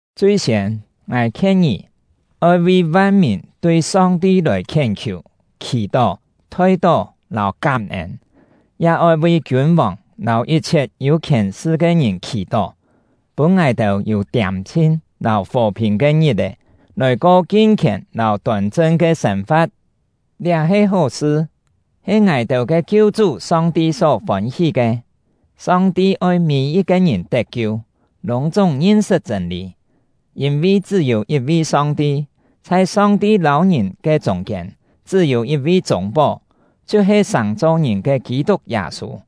Chui-siên, ngài khien ngì, oi vi van-mìn tui Song-ti lòi khién-khiù, khì-tó, thoi-tó, lâu kám-ên; ya oi vi kiûn-vòng lâu yit-chhiet yû khièn-sṳ ke ngìn khì-tó, pûn ngài-têu yû tiâm-chhin lâu fò-phìn ke ngit-è, lòi ko kin-khièn lâu tôn-chang ke sên-fa̍t. Liá he hó-sṳ, he ngài-têu ke Kiu-chú Song-ti só fôn-hí ke. Song-ti oi mî-yit-ke ngìn tet-kiu, lûng-chúng ngin-sṳt chṳ̂n-lî. Yîn-vi chṳ́-yû yit-vi Song-ti, chhai Song-ti lâu ngìn ke chûng-kiên chṳ́-yû yit-vi chûng-pó, chhiu-he sàng-cho ngìn ke Kî-tuk Yâ-sû;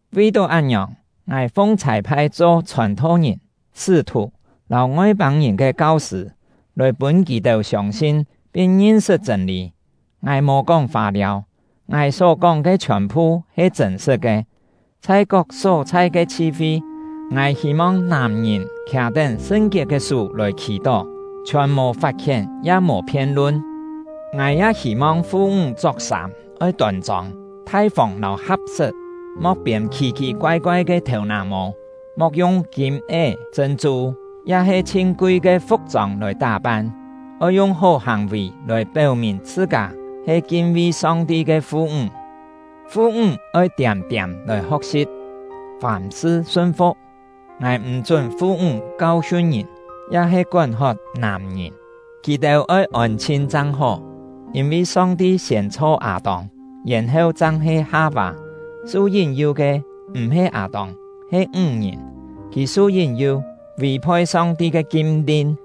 Vi-tó án-ngiòng, ngài fung chhâi-phai cho chhòn-tho-ngìn, sṳ́-thù, lâu Ngoi-pâng-ngìn ke kau-sṳ̂, lòi pûn kì-têu siông-sin pin ngin-sṳt chṳ̂n-lî. Ngài mò kóng fâ-liâu; ngài só-kóng ke chhiòn-phu he chṳ̂n-sṳ̍t ke! Chhai kok só-chhai ke chhi-fi, ngài hî-mong nàm-ngìn khià-tén sṳn-kiet ke sú lòi khì-tó, chhiòn mò fat-khién, ya mò phien-lun. Ngài ya hî-mong fu-ńg chok-sâm oi tôn-chông, thai-fông lâu ha̍p-sṳt; mo̍k piên khì-khì koai-koai ke thèu-nà-mô; mo̍k yung kîm-é, chṳ̂n-chû, ya-he chhin kui ke fu̍k-chông lòi tá-pan. Oi yung hó hàng-vì lòi péu-mìn chhṳ-kâ he kin-vi Song-ti ke fu-ńg. Fu-ńg oi tiâm-tiâm lòi ho̍k-si̍p, fàm-sṳ sun-fu̍k. Ngài m̀ chún fu-ńg kau-hiun ngìn, ya-he kón-hot nàm-ngìn; kì-têu oi ôn-chhin chang hó. Yîn-vi Song-ti siên chho Â-tông, yèn-heu chang he Ha-vâ. Su yín-yu ke m̀-he Â-tông, he ńg-ngìn; kì su yín-yu, vì-phoi Song-ti ke kim-lin.